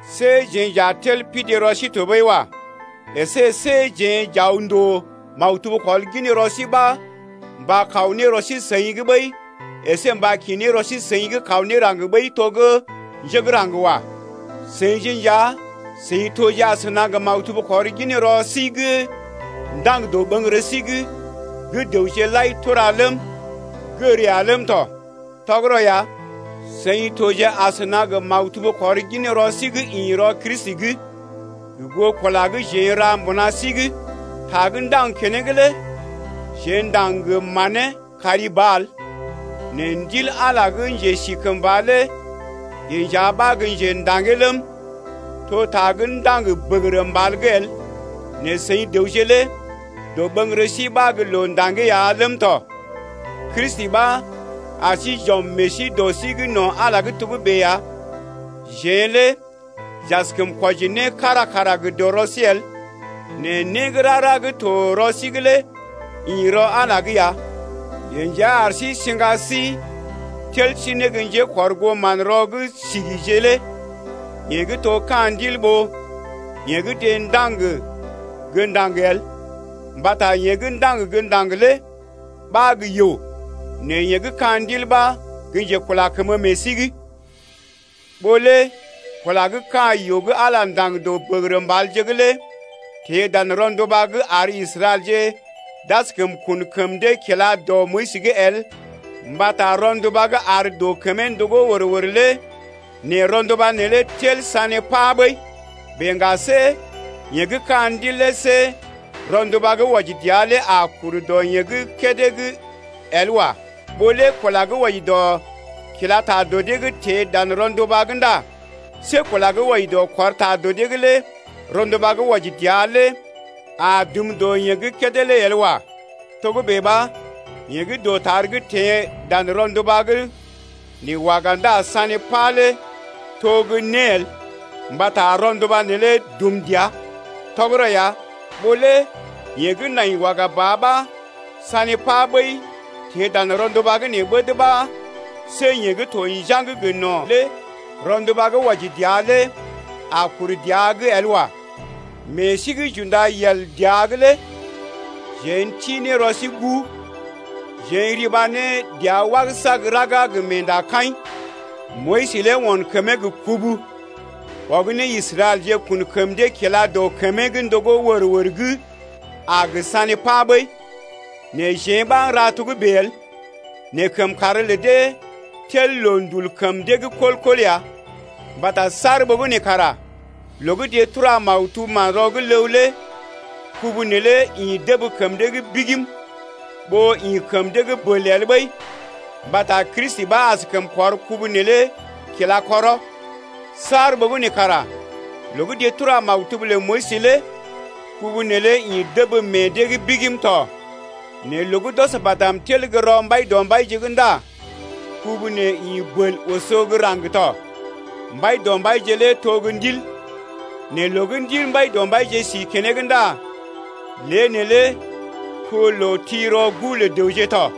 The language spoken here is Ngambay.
See jeḛ j’a tel pidi rɔ sí tɔɓəi wa. Esé see jeḛ j’aw ndòo maktub kɔrginrɔ sí ɓa mba kaw ne rɔ sí-seḭ’g ɓəi əsé mba kḭ ne rɔ sí-seḭ’g kaw ne raŋg ɓəi to gə́ njé gə́ raŋg bèe wa. Seḭje nja seḭ toje asəna gə maktub kɔrginrɔ sí gə́ ndaŋg dɔɓəŋgərə sí’g gə́ dəwje lai tura ləm, gər ya ləm tɔ. Tɔgərɔ ya, seḭ toje asəna gə maktub kɔrginrɔ sí gə́ ḭ rɔ Kristi’g gə goo kula gə́ jeḛ n’ra mbuna sí’g. Ta gə́ ndaŋg keneŋ lé jeḛ ndaŋg gə manee kari ba el nɛ Ndil Ala gə́ njesikəmba lé yeḛ nja ɓa gə́ njḛda̰gee ləm, to ta gə́ ndaŋg bəgərə mbal’g el, nɛ seḭ dəwje lé dɔɓəŋgərə sí ɓa gə́ loo ndaŋgee ya ləm tɔ. Kristi ɓa ar sí j’ɔm meḛ sí dɔ sí’g no̰ Ala’g togə́bè ya. Jeḛ lé j’askəm kwɔji né kára kara gə dɔrɔ sí el nɛ né gə́ rara gə́ to rɔ sí’g lé ḭ rɔ Ala’g ya. Yeḛ nja ar sí siŋga sí tel sí ne gə́ njékɔrgoo manrɔ gə́ sigije lé yeḛ gə́ to ka̰ Ndil ɓó yeḛ gə́ deḛ ndaŋg gə́ ndaŋg el. Mbata yeḛ gə́ ndaŋg gə́ ndaŋg lé ɓa gə́ yoo, nɛ yeḛ gə́ ka̰ Ndil ɓa gə́ njekula kəmə meḛ sí’g. Ɓó lé kula gə́ ka̰ yoo gə́ Ala ndaŋg dɔ bəgərə mbalje’g lé teḛ dan rɔnduba’g ar Israɛlje d’askəm kun kəm dee kila dɔ Moyis’g el mbata rɔnduba gə́ ar dɔ kəmee ndogó wər-wər lé nɛ rɔnduba neelé tel sané pa ɓəi bèe ŋga see yeḛ gə́ ka̰ Ndil lé see rɔnduba gə́ wɔji dəa lé a kur dɔ yeḛ gə́ kédé’g el wa. Ɓó lé kula gə́ wɔji dɔ kila ta dɔ dee’g teḛ dan rɔnduba’g ndá see kula gə́ wɔji dɔ kɔr ta dɔ dee’g lé rɔnduba gə́ wɔji dəa lé a dum dɔ yeḛ gə́ kédé lé el wa. Togə́bè ɓa yeḛ gə́ dɔtar gə́ teḛ dan rɔnduba’g nɛ waga ndá sané pa lé to gə́ né el mbata rɔnduba neelé dum dəa. Tɔgərɔ ya, ɓó lé yeḛ gə́ nai waga ba ɓa sané pa ɓəi teḛ dan rɔnduba’g nɛ ɓəd ɓa see yeḛ gə́ to njaŋg gə no̰ lé rɔnduba gə́ wɔji dəa lé a kur dəa’g el wa. Meḛ sí gə́ j’unda yel dəa’g lé jeḛ n’ti ne rɔ sí guu, jeḛ n’riba ne dəa wagəsa gə raga gə meendakaḭ. Moyis lé on kəmee gə kubu ɔg ne Israɛlje kun kəm dee kila dɔ kəmee gə́ ndogó wər-wər gə́ a gə sané pa ɓəi, nɛ jeḛ ɓa n’ra togə́bè el. Nɛ kəmkàr lə dee tel loondul kəm dee’g kɔl-kɔl ya. Mbata saar ɓogənè kara loo gə́ deḛ tura maktub Manrɔ gə́ Ləw lé kubu neelé dəb kəm dee’g bigim ɓó ḭ kəm dee’g bəl el ɓəi mbata Kristi ɓa askəm kɔr kubu neelé kila kɔrɔ. Saar ɓogənè kara loo gə́ deḛ tura maktub lə Moyis lé kubu neelé ḭ dəb meḛ dee’g bigim tɔ. Nɛ loo gə́ d’ɔs badm tel gə́ rɔ Mbaidɔmbaije’g ndá kubu nee ḭ bəl oso gə́ raŋg tɔ. Mbaidɔmbaije lé to gə́ Ndil, nɛ loo gə́ Ndil Mbaidɔmbaije si keneŋ ndá lé neelé to loo ti rɔ guu lə dəwje tɔ.